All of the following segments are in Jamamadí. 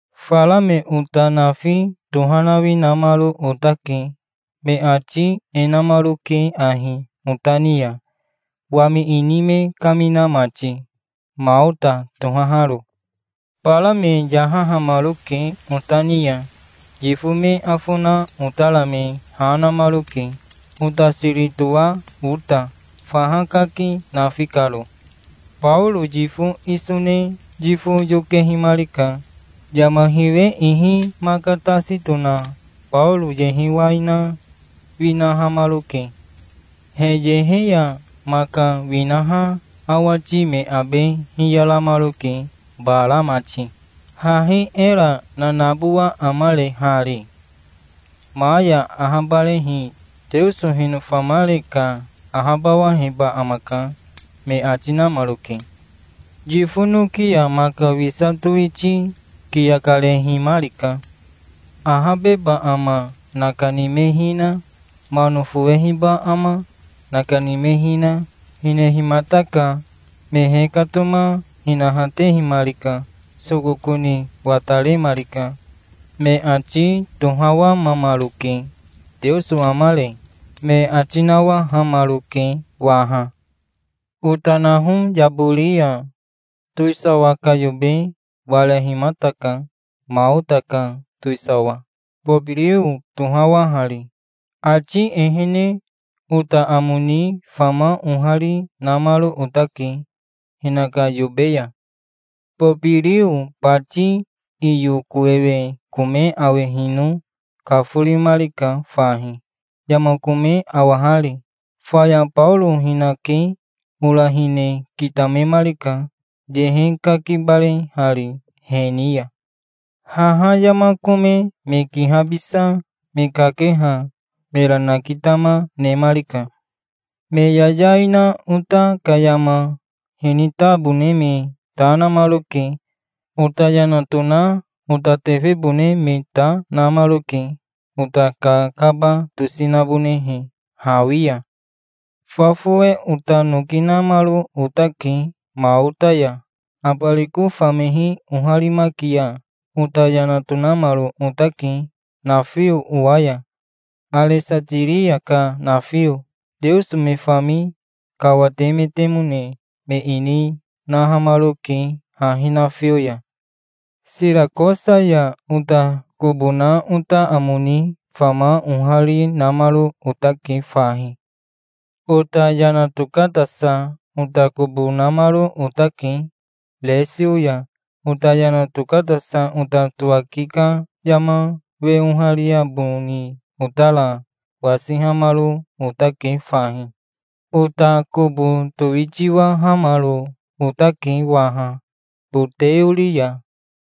Fara me ota nafi tohanawi namaro otake. Me ati e namaroke ahi ota ni ya, wami ini me kamina mati, Maota tohaharo. Bara me yahahamaroke ota ni ya. Yifo me afo na otara me ha namaroke, ota siri toa ota, faha kaki nafi karo. Baoro yifo iso ne yifo yokehimarika. Yama hiwe ihi maka tasi tona Baoro yehe wai na winahamaroke. He yehe ya maka winaha awati me abe hiyaramaroke, bara mati. "Hahi era nanabowa amare hari? Ma ya ahabarehi Teoso hinofamare ka ahabawaheba amaka", me ati namaroke. Yifo noki ya maka wisa towiti kiya karehimarika. Ahabeba ama nakani me hina, mano fowehiba ama nakani me hina, hinehimataka. Me hekatoma hinahatehimarika. Sokoko ni wataremarika. Me ati tohawamamaroke. "Teoso amare?" me ati nawahamaroke waha. Ota naho yabori ya towisawa ka yobe warehimataka, Maota ka towisawa, Bobirio toahari. Ati ehene ota amo ni fama ohari namaro otake hinaka yobe ya. Bobirio bati iyo kowewe kome awehino kaforimarika fahi, yama kome awahari. Faya Baoro hinake ora hine kitamemarika, yehe kakibarehari he ni ya. Haha yama kome me kihabisa me kakeha mera nakitama nemarika. Me yayai na ota ka yama hinitabone me ta namaroke. Ota yana tona ota tefebone me ta namaroke, ota kakaba tosi nabonehe hawi ya. Fa fowe ota noki namaro otake Maota ya. Abariko famehi oharimaki ya ota yana tokanamaro otake nafio owa ya, Aresatiria ka nafio. Teoso me fami kawatemetemone me ini nahamaroke hahi nafio ya. Sirakosa ya ota kobo na ota amo ni fama ohari namaro otake fahi. Ota yana tokatasa ota kobo namaro otake Resio ya. Ota yana tokatasa ota towaki ka yama we oharia boni otara wasihamaro otake fahi. Ota kobo towitiwahamaro otake waha Boteori ya.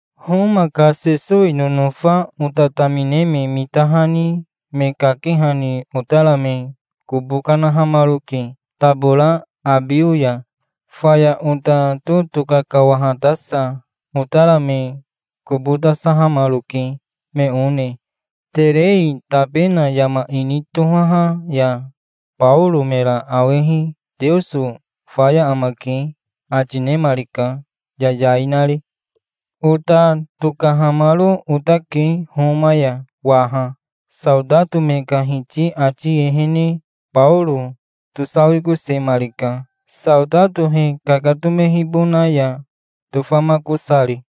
Homa ka Sesowi nonofa ota tamine me mitahani me kakehani otara me kobo kanahamaroke tabora Abio ya. Faya ota totoka kawahatasa otara me kobo tasahamaroke, me one, Terei Tabena yama ini tohaha ya. Baoro mera awehi, "Teoso faya amake", ati nemarika, yayai nari. Ota tokahamaro otake Homa ya waha. Saotato me ka hiti ati ehene Baoro tosawikosemarika, saotato he kakatomehibona ya tofamakosari.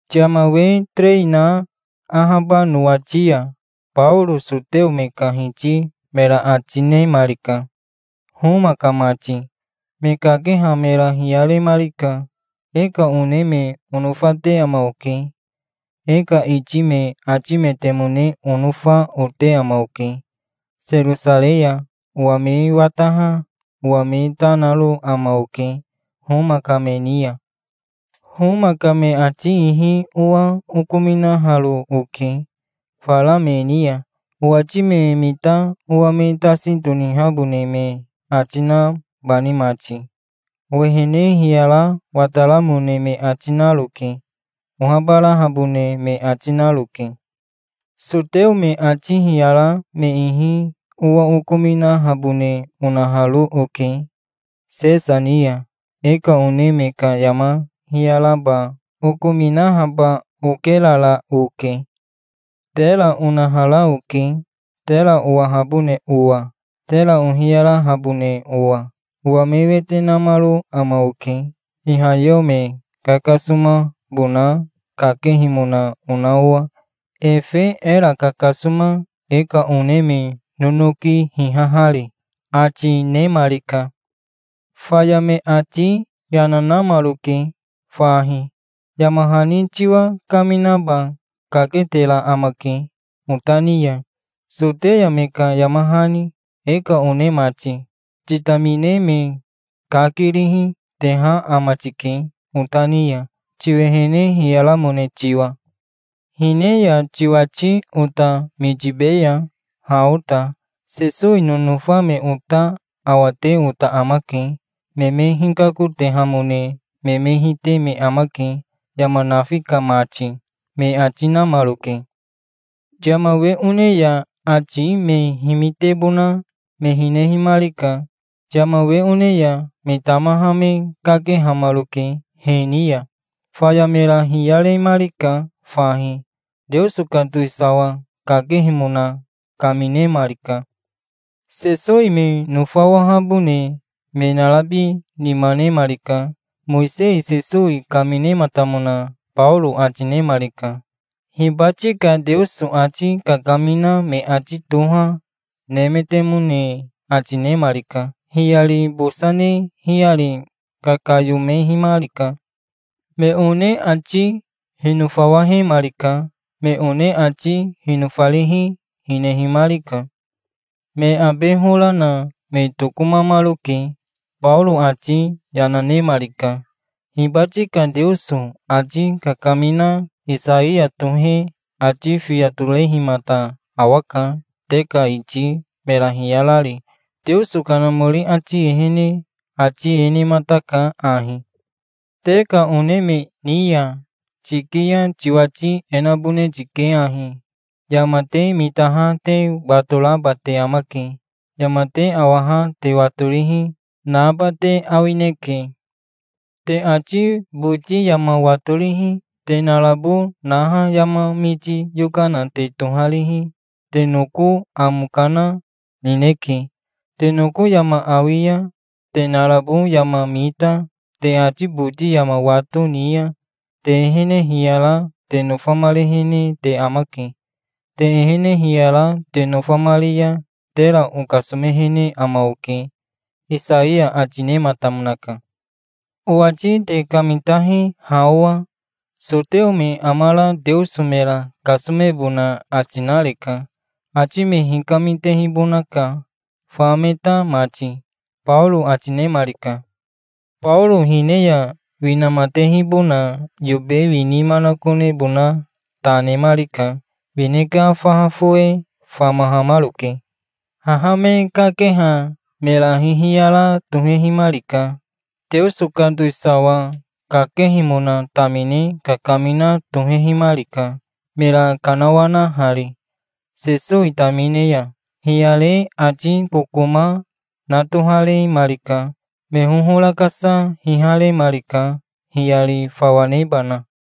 Yama we terei na ahaba nowati ya Baoro soteo me ka hiti mera ati nemarika, Homa ka mati. Me kakeha mera hiyaremarika. "E ka one me onofate ama oke. E ka iti me atimetemone onofa, ote ama oke. Serosarei ya owa me wataha owa me ta naro ama oke Homa ka me ni ya. Homa ka me ati ihi owa okominaharo oke fara me ni ya, owati me mita owa me tasi tonihabone me ati nabani mati. Owehene hiyara wataramone me ati naroke. Ohabarahabone me ati naroke. Soteo me ati hiyara me ihi owa okominahabone onaharo oke Sesa ni ya. E ka one me ka yama hiyaraba okominahaba okerara oke. Tera onahara oke, tera owahabone owa, tera ohiyarahabone owa. Owa me wete namaro ama oke, ihayeo me kakasomabona kakehimona ona owa, efe era kakasoma e ka one me nonoki hihahari", ati nemarika. Faya me ati yana namaroke fahi. "Yama hani tiwa kaminaba kaketera amake ota ni ya, Soteya me ka yama hani, e ka one mati. Titamine me kakirihi, teha ama tike ota ni ya, tiwehene hiyaramone tiwa. Hine ya tiwati ota mitibeya, ha ota. Sesowi nonofa me ota awate ota amake. Me me hikakotehamone me me hite me amake, yama nafi ka mati", me ati namaroke. Yama we one ya ati me himitebona me hinehimarika. Yama we one ya me tamaha me kakehamaroke he ni ya. Faya mera hiyaremarika fahi. Teoso ka towisawa kakehimona kaminemarika. Sesowi me nofawahabone me narabi nima nemarika. Mowisei Sesowi kaminematamona Baoro ati nemarika. Hibati ka Teoso ati kakamina me ati toha nemetemone ati nemarika. Hiyari bosa ne hiyari kakayomehimarika. Me one ati hinofawahemarika. Me one ati hinofarihi, hinehimarika. Me abe hora na me tokomamaroke. Baoro ati yana nemarika. "Hibati ka Teoso ati kakamina Isaiya tohe ati fiya torehimata awaka te ka iti mera hiyarari. Teoso Kanamori ati ehene ati e nemataka ahi: 'Te ka one me ni ya tiki ya tiwati e nabone tike ahi: "Yama te mitaha te watoraba te amake. Yama te awaha te watorihi, naba te awineke. Te ati boti yama watorihi, te narabo naha yama miti yokana te toharihi, te noko amo kana nineke. Te noko yama awi ya te narabo yama mita, te ati boti yama wato ni ya te ehene hiyara te nofamarehene te amake. Te ehene hiyara te nofamari ya tera okasomehene ama oke"', Isaiya ati nematamonaka. Owati te kamitahi ha owa. Soteo me amara Teoso mera kasomebona ati nareka. Ati me hikamitehibonaka, fa me ta mati", Baoro ati nemarika. Baoro hine ya winamatehibona yobe wini manakonebona ta nemarika. Wine ka faha fowe famahamaroke. Haha me kakeha mera hihiyara tohehimarika. Teoso ka towisawa kakehimona tamine kakamina tohehimarika, mera kanawanahari Sesowi tamine ya. Hiyare ati kokoma na toharemarika. Me hohora kasa hiharemarika, hiyari fawa nebana.